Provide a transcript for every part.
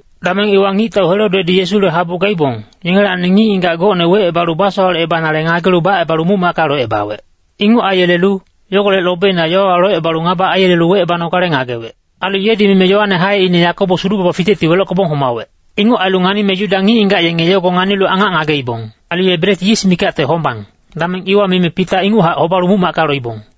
Dameng iwa ngictau Herodedi Yesule habu gaibong, yengelacni ngic-ngigac gocne wecebalu basowalecebanale ngagelu bacebalu muc-macka locebawec. Inguc aiyelelu, yogolec lobeina yowawa locebalu ngaba aiyelelu wecebanogale ngagewec. Ailu yedi mime Yoane haeine Yakobos hudu-baba fitecti welockebong homawec. Inguc ailu nganime Yuda ngic-ngigac yenge yogo nganilu angac ngageibong. Ailu ye bret yis mikacte hombang, dameng iwa mime Pita inguchac hobalu muc-macka loibong.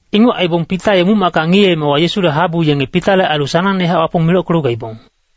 Inguc aibong Pita ye muc-macka ngiyeemewa Yesule habu yenge Pitale ailu sanangnehac Wapong milockelu gaibong.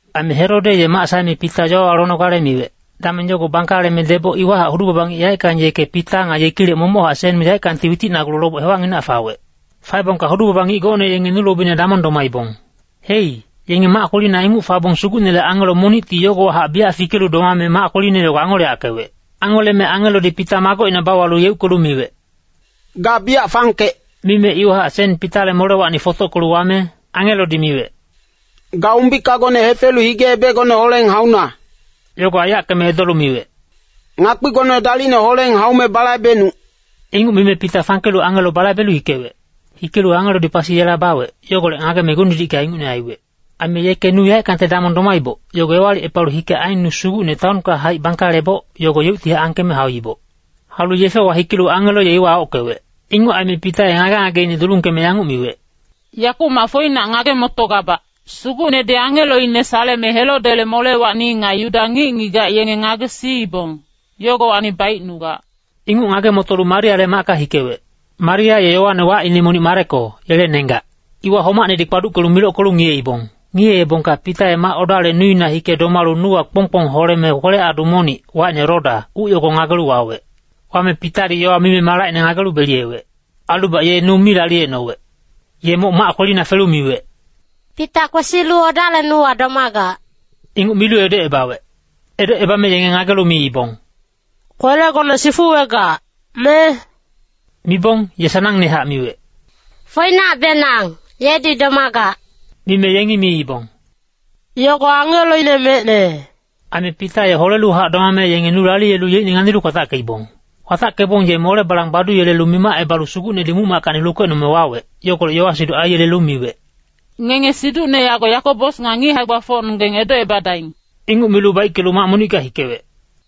Aime Herode ye mac saeme Pita yowawa lonogale miwec, dameng yogo bangkaleme deboc iwahac hudu-baba ngic yaeckang yeke Pita nga yekilec momochac sen yaeckangti witicnagulu loboc hewacnginac fawec. Faebongka hudu-baba ngic gocne yenge nu lobina damong domaibong. Hei, yenge mac kwelina inguc fabong Sugucnele angelo monicti yogowahac biyac fikelu domame mac kweline yogo angoleyackewec. Angoleme angelodi Pita magocina bauwalu yeuckelu miwec, “Ga biyac fangkec.” Mime iwahac sen Pitale molewacni fotockelu wame angelodi miwec, “Ga umbikagone hefelu hige-ebecgone holeng hauna.” Yogo aiyackeme edolu miwec, “Ngakpigone dalicne holeng haume balaibecnuc.” Inguc mime Pita fangkelu angelo balaibelu hikewec. Hikelu angelodi pasi yela bawec, yogolec ngageme gung-didicka ingucne aiwec. Aime yeke nu yaeckangte damong domaiboc, yogo ewalicepalu hike aen nu sugucne taonka haic bangkaleboc, yogo yeuctihac angkeme hauiboc. Haulu yefewa hikelu angelo ye iwa aockewec. Inguc aime Pita ye ngage-ngageine dulungkeme yanguc miwec, “Yakumac foinac ngage-motogabac. Sugucnedi angeloine saleme Herodele molewacni nga Yuda ngic-ngigac yenge ngagesiibong, yogowacni baicnugac.” Inguc ngage-motolu Mariale macka hikewec. Maria ye Yoane wacine monic Mareko, yele nenggac. Iwa homacnedi kpaduckelu milockelu ngiyeibong. Ngiyeebongka Pita ye mac odale nuina hike domalu nuwa kpong-kpong holeme kwelec-adu monic, wacine Roda, uc yogo ngagelu wawec. Wame Pitadi yowa mime malacine ngagelu beliyewec. Ailubac ye nu mi laliyecnowec. Ye moc mac kwelina felu miwec, “Pita kwesilu odale nuwa domagac.” Inguc milu edocebawec. Edocebame yenge ngagelu miibong, “Kwelegone sifuwegac, me?” Mibong, ye sanangnehac miwec, “Foinacbenang, yedi domagac.” Mime yengi miibong, “Yogo angeloine mecne.” Aime Pita ye holeluhac domame yenge nu laliyelu yeicne nganilu kwatackeibong. Kwatackebong ye mole balang baduyelelu mimacebalu Sugucnedi muc-mackacni lukecnome wawec, yogolec yowa-siduc aiyelelu miwec, “Ngenge siducne yago Yakobos nga ngic hae-gbafocnonggeng edocebadaing.” Inguc milu baickelu mac monicka hikewec.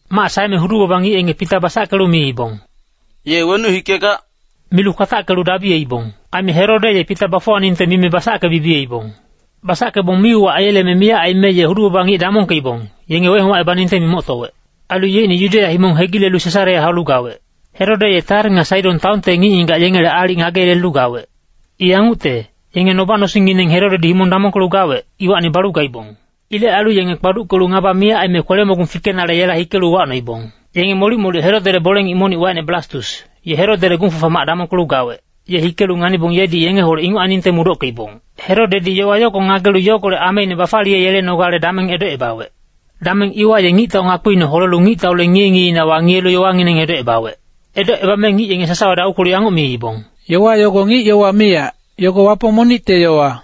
Mac saeme hudu-baba ngic yenge Pita basackelu miibong, “Ye wenuc hikegac?” Milu kwatackelu dabiyeibong. Aime Herode ye Pita bafuwaningte mime basacke-bibiyeibong. Basackebong mi-uwac aiyeleme miyac aime ye hudu-baba ngic damongkeibong, yenge wehomacebaningte mimoctowec. Ailu yeicne Yudeya himong hegilelu Sesarea haulu gawec. Herode ye Tair nga Saidon taonte ngic-ngigac yengele aalic ngageyelelu gawec. I yangucte, yenge noba-nosingngineng Herodedi himong damongkelu gawec, iwacni balu gaibong. Ilec ailu yenge kpaduckelu ngaba miyac aime kwele-mogung fikenale yela hikelu uwacnoibong. Yenge molic-molic Herodele bole-ngic monic wacine Blastus, ye Herodele gung-fafa mac damongkelu gawec, ye hikelu nganibong yedi yengeholec inguc ainingte mudockeibong. Herodedi yowa yogo ngagelu yogolec ameine bafaliyeyelenogale dameng edocebawec. Dameng iwa ye ngictau ngakpiine holelu ngictaule ngiye-ngiyeina wangiyelu yowangineng edocebawec. Edocebame ngic yenge sasawadi aukwelu yanguc miibong, “Yowa yogo ngic-yowa miyac, yogo wapong monicte yowa.”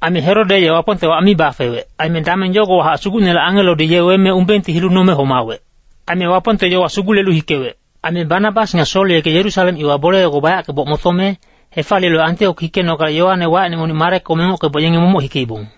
Aime Herode ye Wapongte wac mi bafewec, aime dameng yogowahac Sugucnele angelodi ye weme umbengti hilu nome homawec. Aime Wapongte yowa sugulelu hikewec. Aime Banabas nga Sol yeke Yerusalem iwa bole yogo bayackeboc motome, hefaliyelu Antiok hikenogale Yoane wacine monic Mareko mengockeboc yenge momoc hikeibong.